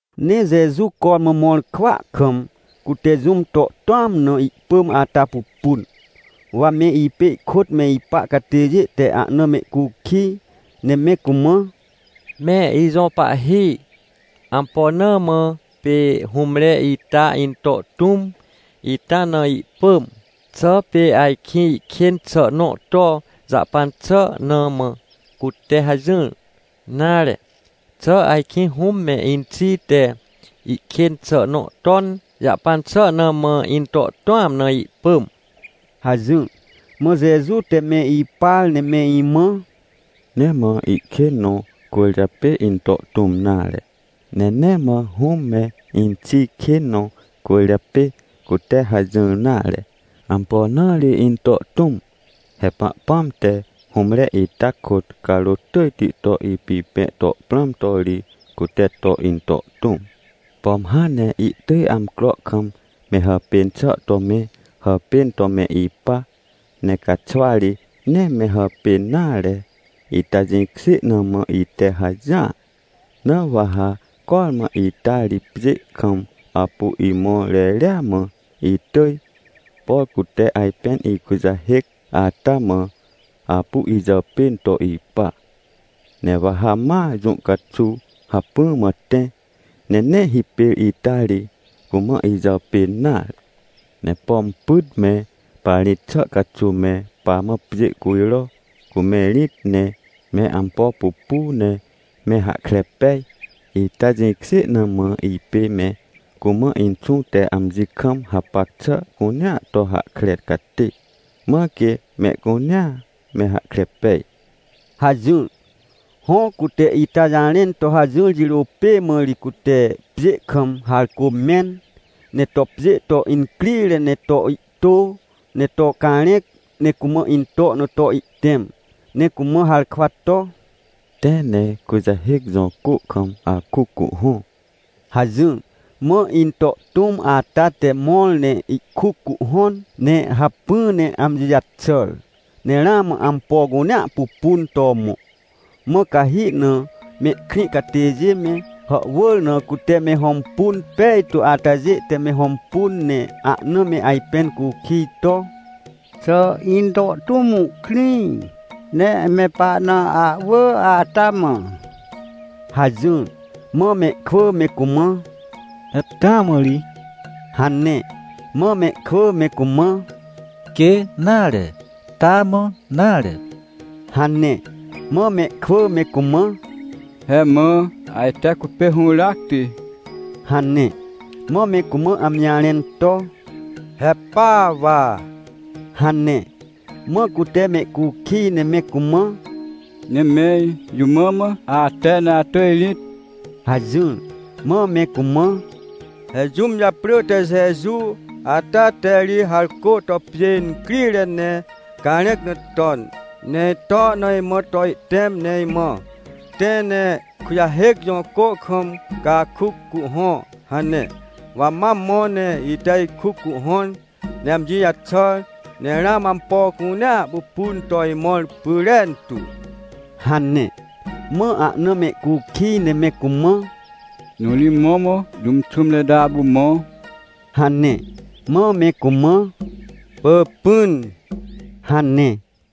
Ne Jeju cormã mõr kwỳa kam, cute jũm to tũam na ihpỳm ata pupun. Wa me ipê ihkôt me ipa catêjê te ahna mehcukij, ne me cumã: — Me ijõ Pahhi, ampo na mã pê hũmre ita into tũm ita na ihpỳm? Xà pê ajkĩ ihkên xà nõ to jahpan xà na mã cute hajỹr? Nare, xà ajkĩ hũm me inxi te ihkên xà nõ ton jahpan xà na mã into tũam na ihpỳm? — hajỹr. Mã Jeju te me ipar ne me imã: — Nee mã ihkên nõ cwỳrjapê into tũm nare, ne nee mã hũm me inxi kên nõ cwỳrjapê cute hajỹr nare. Ampo na ri into tũm? He Pahpãm te hũmre ita kôt carôt tỳjti to ipipẽ to prãm to ri, cute to into tũm. Pom hãn ne ihtỳj amcro kam me hàpên xà to me hàpên to me ipa, ne caxwari nee me hàpên nare. Ita jĩkjê na mã ite hajỹar. Na wa ha cormã ita ri pjê kam apu imõr reria mã itỳj, por cute ajpên ikujahêc ata mã, apu ijàpên to ipa. Ne wa ha ma jũ caxuw hacpỹ mã tẽ, ne nee hipêr ita ri cumã ijàpên nare. Ne pom pyt me parĩt xà caxuw me pamã pjê cujro, cu me rĩt, ne me ampo pupu ne me hahkre pej, ita jĩkjê na mã ipê me cumã Inxũ te amji kam hapac xà cunea to hahkre catê, mãr quê mehcunea me hahkre pej — hajỹr. Hõ, cute ita jarẽn to hajỹr jirô pê mã ri cute pjê kam harcô mẽn, ne to pjê to incrire ne to ihtô, ne to carẽc ne cumã into na to ihtẽm, ne cumã harkwa to: — Tẽ ne Kujahêc jõ cô kam akuc cuhhõ — hajỹr. Mã into tũm ata te mõr ne ihkuc cuhhõn, ne hacpỹ ne amji jaxàr, ne ramã ampo cunea pupun to mõ. Mã cahi na mehkrĩ catêjê me, hàhwỳr na cute me hõmpun pejtu atajê te me hõmpun, ne ahna me ajpẽn cukij to: — Xà into tũm ihkrĩ ne me pahna ahwỳ ata mã? — hajỹr. Mã mehkwỳ me cumã: — He taa mã ri! — hane. Mã mehkwỳ me cumã: — Quê nare! Taa mã nare! — hane. Mã mehkwỳ me cumã: — He mã ajte cupê hũràcti — hane. Mã me cumã amji jarẽn to: — He pa wa! — hane. Mã cute mehcukij ne me cumã: — Ne mẽr jũ mã mã ate ne atỳj rĩt? — hajỹr. Mã me cumã: — He jũm japrỳ te Jeju ata te ri harcô to pjê incrire ne carẽc na ton, ne ito na imã to ihtẽm ne imã: “Tẽ ne Kujahêc jõ cô kam ca akuc cuhhõ” hane. Wa ma mõ ne ite ikuc cuhhõn, ne amji jaxàr, ne ramã ampo cunea pupun to imõr pyrentu — hane. Mã ahna mehcukij ne me cumã: — Jõ ri mõrmõ jũm xũmre ita apu mõ? — hane. Mã me cumã: — Pỳpỹn — hane.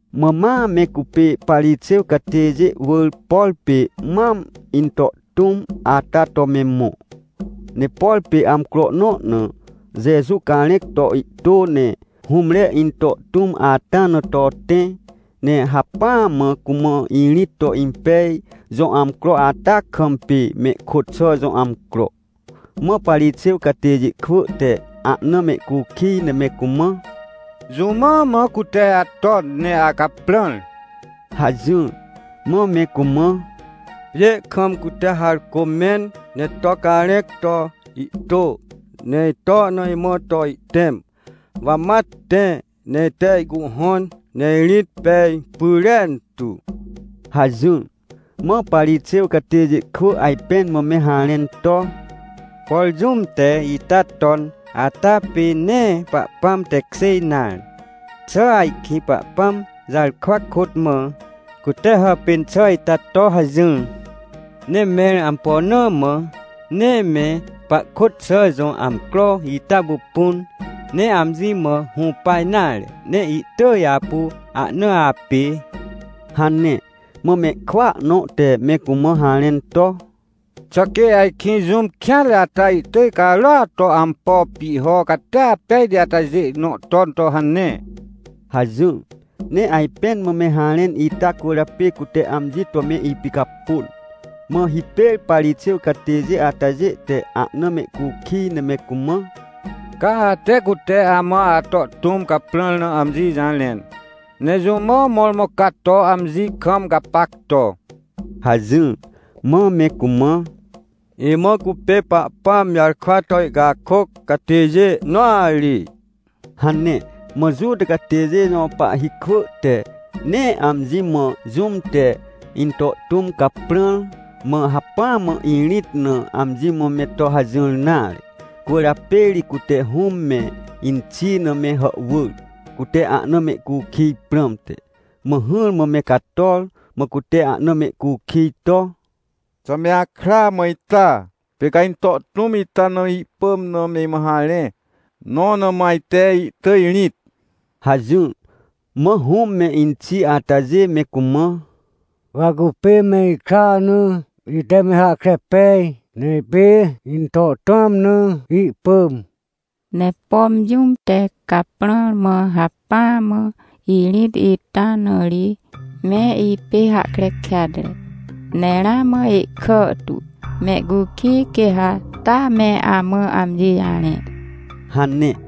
Mã ma me cupê Parixêw catêjê wỳr, por pê mam into tũm ata to me mõ. Ne por pê amcro nõ na Jeju carẽc to ihtô, ne hũmre into tũm ata na to tẽ, ne hacpỹa mã cumã irĩt to impej jõ amcro ata kam pê mehkôt xà jõ amcro. Mã Parixêw catêjê kwỳ te ahna mehcukij ne me cumã: — Jũ mã mã cute aton ne acaprãr? — hajỹr. Mã me cumã: — Pjê kam cute harcô mẽn ne to carẽc to ihtô, ne ito na imã to ihtẽm, wa ma tẽ ne ite ihcuhhõn ne irĩt pej pyrentu — hajỹr. Mã Parixêw catêjê kwỳ ajpẽn mã me harẽn to: — Por jũm te ita ton ata pê nee Pahpãm tekjê nare. Xà ajkĩ Pahpãm jarkwa kôt mã cute hàpên xà ita to hajỹr? Ne mẽr ampo na mã nee me pahkôt xà jõ amcro ita pupun, ne amji mã hũpa nare, ne ihtỳj apu ahna apê? — hane. Mã mehkwỳa nõ te me cumã harẽn to: — Xà quê ajkĩ jũm kêanre ata ihtỳj carôat to ampo pihho catia pejti atajê nõ ton to hane? — hajỹr. Ne ajpẽn mã me harẽn ita cwỳrjapê cute amji to me ipicapôn. Mã hipêr Parixêw catêjê atajê te ahna mehcukij ne me cumã: — Ca ate cute amã ato tũm caprãr na amji jarẽn, nejũ mã mõrmõ ca to amji kam gapac to? — hajỹr. Mã me cumã: — Imã cupê Pahpãm jarkwa to ihcakôc catêjê nõa ri — hane. Mã Juta catêjê jõ pahhi kwỳ te nee amji mã, jũm te into tũm caprãr, mã hacpỹa mã irĩt na, amji mã me to hajỹr nare. Cwỳrjapê ri cute hũm me inxi na me hàhwỳr, cute ahna mehcukij prãmte. Mã hỹrmã me cator, mã cute ahna mehcukij to: — Xà me akra mã ita? Pê ca into tũm ita na ihpỳm na me imã harẽ, nõ na mã ajte ihtỳj rĩt? — hajỹr. Mã hũm me inxi atajê me cumã: — Wa cupê me ikra na ite me hahkre pej, ne pê into tũam na ihpỳm. Ne pom jũm te caprãr, mã hacpỹa mã irĩt ita na ri, me ipê hahkre kêatre. Ne ramã ihkàhtu. Mehcukij, quê ha taa me amã amji jarẽ — hane.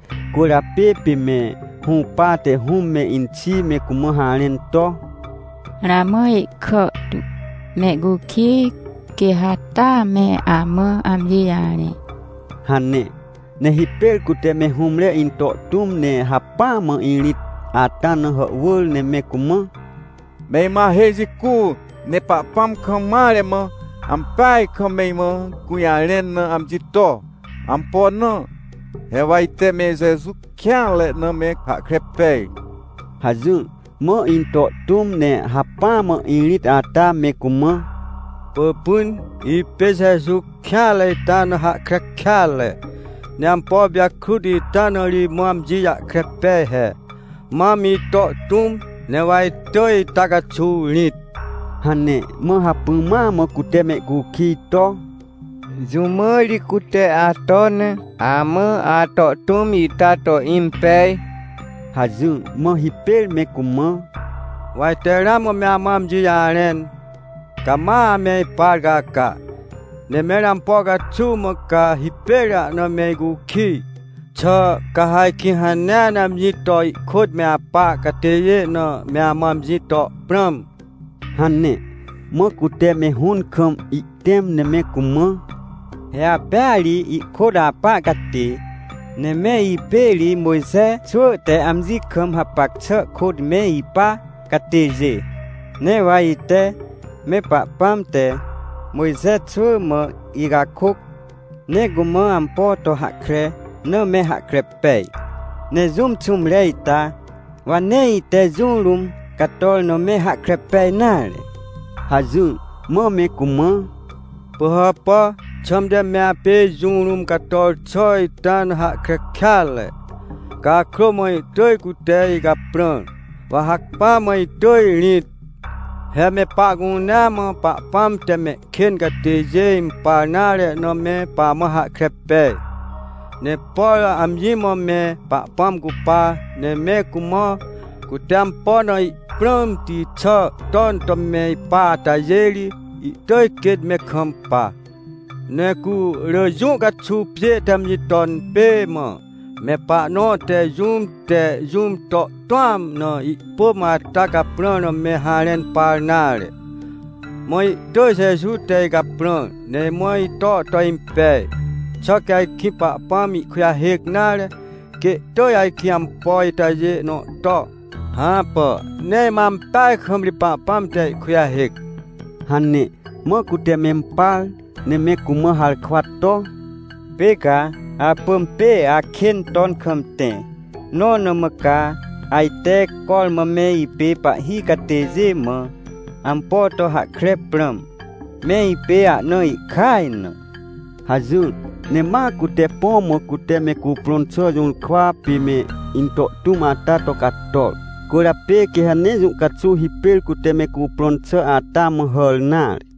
Cwỳrjapê pê me hũpate hũm me inxi me cumã harẽn to: — Ramã ihkàhtu, mehcukij, quê ha taa me amã amji jarẽ — hane. Ne hipêr cute me hũmre into tũm ne hacpỹa mã irĩt ata na hàhwỳr, ne me cumã: — Me imã ahêj jicu ne Pahpãm kam mare mã ampeaj kam me imã gũjarẽn na amji to. Ampo na? He wa ite me Jeju kêanre na me hahkre pej — hajỹr. Mã into tũm ne hacpỹa mã irĩt ata me cumã: — Pỳpỹn, ipê Jeju kêanre ita na hahkre kêatre, ne ampo pijakrut ita na ri imã amji jahkre pej he, mam ito tũm, newa itỳj ita caxuw rĩt — hane. Mã hacpỹ ma mã cute mehcukij to: — Jũ mã ri cute aton ne amã ato tũm ita to impej? — hajỹr. Mã hipêr me cumã: — Wa ite ramã me amã amji jarẽn, ca ma ame ipar caca. Ne mẽr ampo caxuw mã ca hipêr ahna me icukij? Xà ca ha ajkĩ hanea ne amji to ihkôt me apa catêjê na me amã amji to prãm? — hane. Mã cute me hũn kam ihtẽm, ne me cumã: — He apêa ri ihkôt apa catê, ne me ipê ri Mojxe xwỳ te amji kam hapac xà kôt me ipa catêjê. Ne wa ite me Pahpãm te Mojxe xwỳ mã ihcakôc, ne cumã ampo to hahkre na me hahkre pej. Ne jũm xũmre ita, wa nee ite jũ rũm cator na me hahkre pej nare — hajỹr. Mã me cumã: — Pỳhàpà! Xãmte me apê jũ rũm cator xà ita na hahkre kêatre? Cakrô mã ihtỳj cute icaprãr, wa hacpỹa mã itỳj rĩt. He me pahcunea mã Pahpãm te mehkên catêjê impar nare na me pamã hahkre pej. Ne por amji mã me Pahpãm cupa, ne me cumã, cute ampo na ihprãmti xà ton to me ipa atajê ri, ihtỳj quêt me kampa. Ne cu rỳ jũ caxuw pjê te amji ton pê mã, me pahnõ te jũm te jũm to tũam na ihpỳm ata caprãr na me harẽn par nare. Mã ihtỳj Jeju te icaprãr, ne imã ito to impej. Xà quê ajkĩ Pahpãm ihkujahêc nare, quê ihtỳj ajkĩ ampo itajê nõ to? Hãpà, ne imãa ampeaj kam ri Pahpãm te ihkujahêc — hane. Mã cute mempar, ne me cumã harkwa to: — Pê ca apỳm pê akên ton kam tẽ, nõ na mã ca ajte cormã me ipê pahhi catêjê mã ampo to hahkre prãm? Me ipê ahna ihkaj na! — hajỹr. Ne ma cute põ mã cute me cuprõn xà jũrkwa pê me into tũm ata to cator. Cwỳrjapê quê ha nee jũ caxuw hipêr cute me cuprõn xà ata mã hàr nare.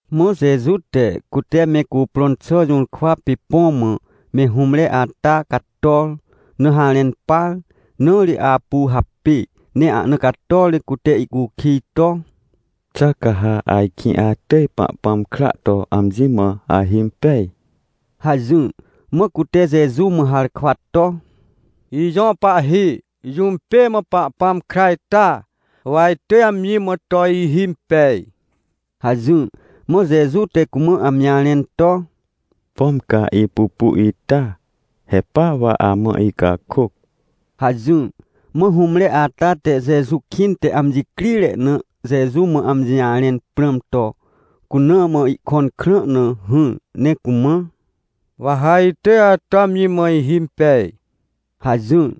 Mã Jeju te, cute me cuprõn xà jũrkwa pê põ mã me hũmre ata cator na harẽn par. Na ri apu hapê ne ahna cator ne cute ihcukij to: — Xà ca ha ajkĩ atỳj Pahpãm kra to amji mã ahimpej? — hajỹr. Mã cute Jeju mã harkwa to: — Ijõ Pahhi, jũm pê mã Pahpãm kra ita? Wa itỳj amji mã to ihimpej — hajỹr. Mã Jeju te cumã amji jarẽn to: — Pom ca ipupu ita! He pa wa amã icakôc — hajỹr. Mã hũmre ata te Jeju kĩnte amji crire na Jeju mã amji jarẽn prãm to, cuna mã ihkõn krã na hỹr, ne cumã: — Wa ha itỳj ato amji mã ihimpej — hajỹr.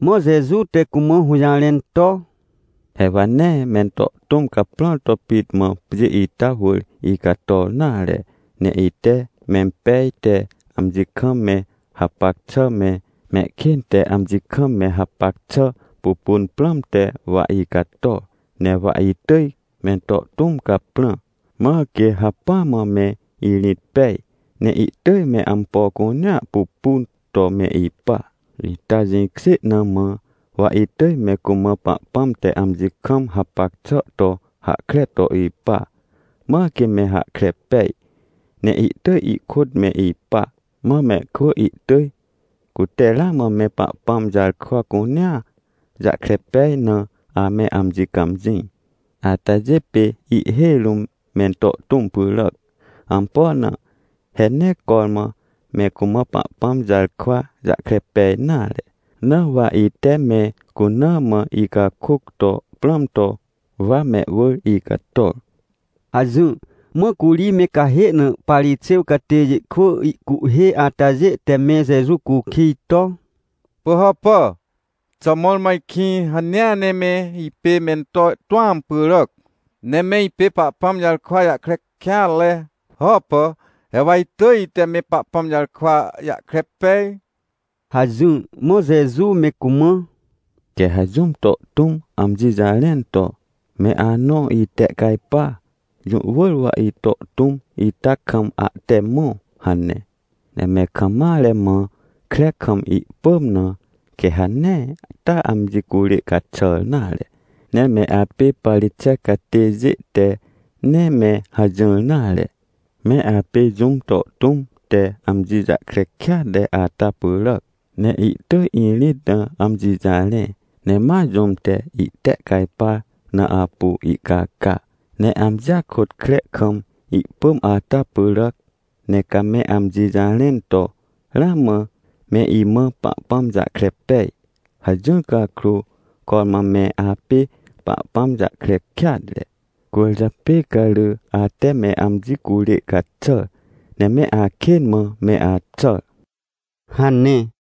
Mã Jeju te cumã hũjarẽn to: — He wa nee mento tũm caprãr to pit mã pjê ita wỳr icator nare. Ne ite mempej te amji kam me hapac xà me, mehkên te amji kam me hapac xà pupun prãmte wa icator. Ne wa itỳj mento tũm caprã, mãr quê hacpỹa mã me irĩt pej, ne ihtỳj me ampo cunea pupun to me ipa. Ita jĩkjê na mã wa itỳj me cumã Pahpãm te amji kam hapac xà to hahkre to ipa, mãr quê me hahkre pej, ne ihtỳj ihkôt me ipa. Mã mehkwỳ ihtỳj, cute ramã me Pahpãm jarkwa cunea jahkre pej na ame amji cãmjĩ, atajê pê ihhêj rũm mento tũm pyràac. Ampo na? He nee cormã me cumã Pahpãm jarkwa jahkre pej nare, na wa ite me cuna mã icakôc to prãm to, wa mehwỳr icator — hajỹr. Mã curi me cahê na Parixêw catêjê kwỳ ihcuhhê atajê te me Jeju cukij to: — Pỳhàpà! Xà mõrmõ ajkĩ hanea ne me ipê mento tũam pyràac, ne me ipê Pahpãm jarkwa jahkre kêatre? Hãpà! He wa itỳj ite me Pahpãm jarkwa jahkre pej — hajỹr. Mã Jeju me cumã: — Quê ha jũm to tũm amji jarẽn to: “Me anõ itehcajpa, jũ wỳr wa ito tũm ita kam ahte mõ” hane, ne me kam mare mã kre kam ihpỳm na, quê ha nee taa amji curê caxàr nare. Ne me apê Parixêw catêjê te nee me hajỹr nare. Me apê jũm to tũm te amji jahkre kêatre ata pyràac. Ne ihtỳj irĩt na amji jarẽ, ne ma jũm te ihtehcajpar na apu ihcaca, ne amjia kôt kre kam ihpỳm ata pyràac. Ne ca me amji jarẽn to: “Ramã me imã Pahpãm jahkre pej” hajỹr cakrô, cormã me apê Pahpãm jahkre kêatre. Cwỳrjapê ca rỳ ate me amji curê caxàr ne me akên mã me axàr — hane.